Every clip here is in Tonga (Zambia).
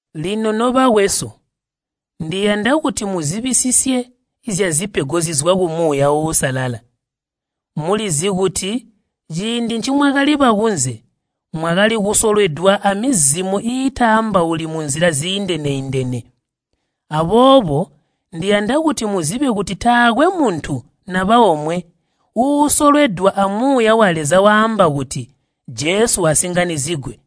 Lino nobakwesu, ndiyanda kuti muzibisisye zyazipego zizwa ku Muuya Uusalala. Mulizi kuti ciindi ncimwakali bakunze, mwakali kusolwedwa amizimo iitambauli munzila ziindene-indene. Aboobo ndiyanda kuti muzibe kuti taakwe muntu naba omwe uusolwedwa a Muuya wa Leza waamba kuti, “Jesu asinganyizigwe,”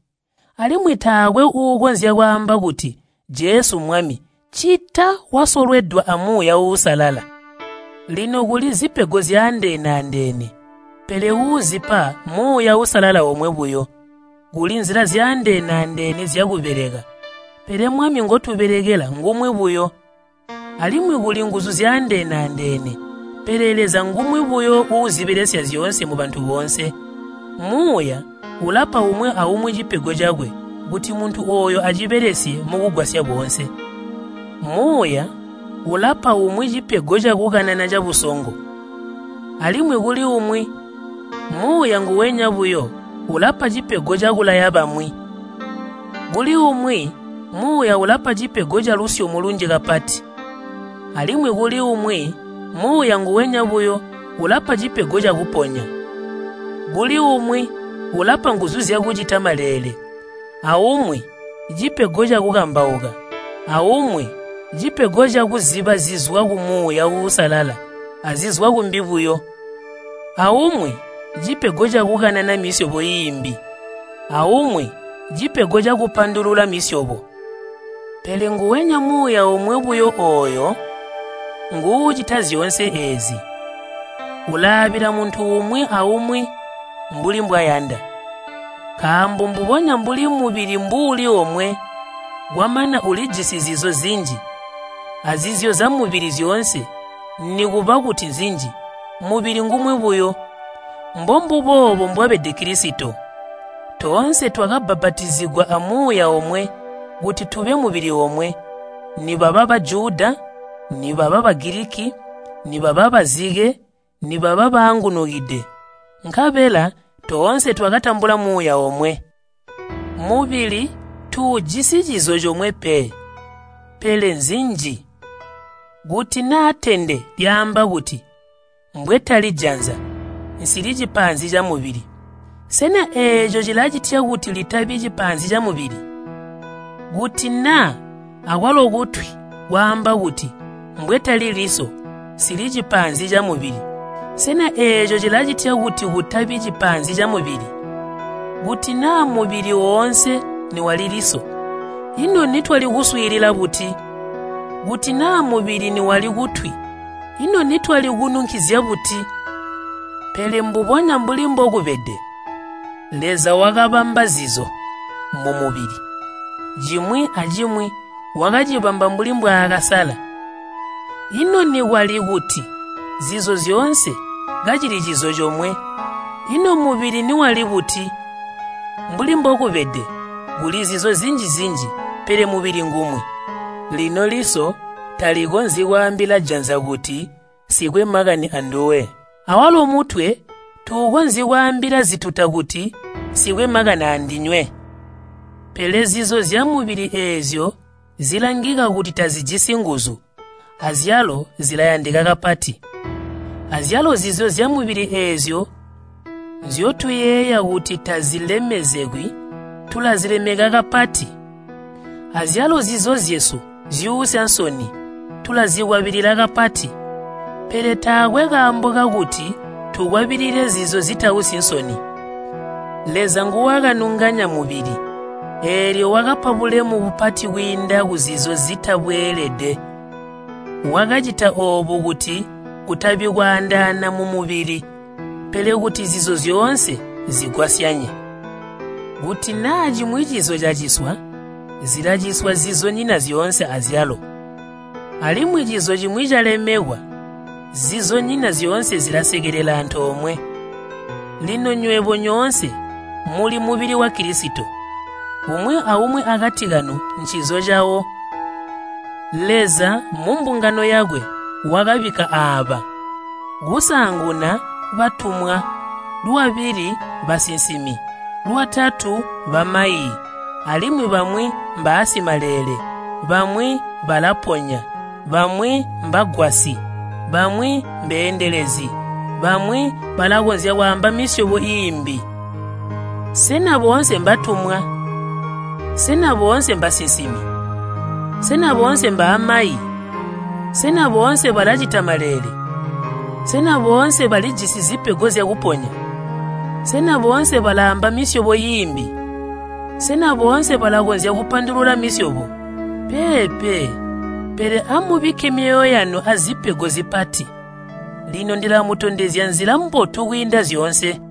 alimwi taakwe uukonzya kwaamba kuti “Jesu Mwami” ccita wasolwedwa a Muuya Uusalala. Lino kuli zipego zyaandeene-andeene, pele uuzipa Muuya Uusalala omwe buyo. Kuli nzila zyaandene-andeene zyakubeleka, pele Mwami ngotubelekela ngumwi buyo. Alimwi kuli nguzu zyaandeene-andeene, pele Leza ngumwi buyo uuzibelesya zyoonse mubantu boonse. Muuya ulapa umwi aumwi cipego cakwe kuti muntu ooyo acibelesye mukugwasya boonse. Muuya ulapa umwi cipego cakukanana cabusongo. Alimwi kuli umwi Muuya nguwenya buyo ulapa cipego cakulaya bamwi. Kuli umwi Muuya ulapa cipego calusyomo lunji kapati. Alimwi kuli umwi Muuya nguwenya buyo ulapa cipego cakuponya. Kuli umwi ulapa nguzu zyakucita maleele, aumwi cipego cakukambauka, aumwi cipego cakuziba zizwa ku Muuya Uusalala azizwa kumbi buyo, aumwi cipego cakukanana misyobo iimbi, aumwi cipego cakupandulula misyobo. Pele nguwenya Muuya omwe ooyo nguucita zyoonse eezi. Ulaabila muntu umwi aumwi mbuli mbwayanda. Nkaambo mbubonya mbuli mubili mbuuli omwe, kwamana ulijisi zizo zinji, azizo zyamubili zyoonse nikuba kuti nzinji, mubili ngumwi buyo, mbombuboobo mbwabede Kilisito. Toonse twakabbapatizigwa a Muuya omwe kuti tube mubili omwe, nibaba Bajuda, nibaba Bagiliki, nibaba bazike, nibaba baangunukide, nkabela toonse twakatambula Muuya omwe. Mubili tuujisi cizo comwe pe, pele nzinji. Kuti naa tende lyaamba kuti, “Mbwetali janza nsili cipaanzi camubili,” sena eeco cilacitya kuti litabi cipaanzi camubili? Kuti naa akwalo kutwi kwaamba kuti, “Mbwetali liso nsili cipaanzi camubili,” sena eeco cilicitya kuti kutabi cipaanzi camubili? Kuti naa mubili woonse niwali liso, ino nitwali kuswiilila buti? Kuti naa mubili niwali kutwi, ino nitwali kununkizya buti? Pele mbubonya mbuli mbokubede, Leza wakabamba zizo mumubili, cimwi acimwi wakacibamba mbuli mbwaakasala. Ino nikwali kuti zizo zyoonse kacili cizo comwe, ino mubili niwali buti? Mbuli mbokubede, kuli zizo zinji-zinji pele mubili ngumwi. Lino liso talikonzyi kwaambila janza kuti “Nsikwe makani anduwe!” Awalo mutwe tuukonzyi kwaambila zituta kuti, “Nsikwe makani andinywe!” Pele zizo zyamubili eezyo zilangika kuti tazijisi nguzu, azyalo zilayandika kapati. Azyalo zizo zyamubili eezyo nzyotuyeeya kuti tazilemekekwi, tulazilemeka kapati. Azyalo zizo zyesu zyuusya nsoni, tulazikwabilila kapati. Pele taakwe kaambo kakuti tukwabilile zizo zitausyi nsoni. Leza nguwakanunganya mubili, eelyo wakapa bulemu bupati kwiinda kuzizo zitabweelede. Wakacita oobu kuti kutabi kwaandaana mumubili, pele kuti zizo zyoonse zigwasyanye. Kuti naa cimwi cizo caciswa, zilaciswa zizonyina zyoonse azyalo. Alimwi cizo cimwi calemekwa zizonyina zyoonse zilasekelela antoomwe. Lino nywebo nyoonse muli mubili wa Kilisito. Umwi aumwi akati kanu ncizo cawo. Leza mumbungano yakwe wakabikka aaba, kusaanguna batumwa, lwabili basinsimi, lwatatu bamayi, alimwi bamwi mbaasimaleele, bamwi balaponya, bamwi mbagwasyi, bamwi mbeendelezi, bamwi balakonzya kwaamba misyobo iimbi. Sena boonse mbatumwa? Sena boonse mbasinsimi? Sena boonse mbaamayi? Sena boonse balacita maleele? Sena boonse balijisi zipego zyakuponya? Sena boonse balaamba misyobo iimbi? Sena boonse balakonzya kupandulula misyobo? Peepe, pele amubikke myoyo yanu azipego zipati. Lino ndilamutondezya nzila mbotu kwiinda zyoonse.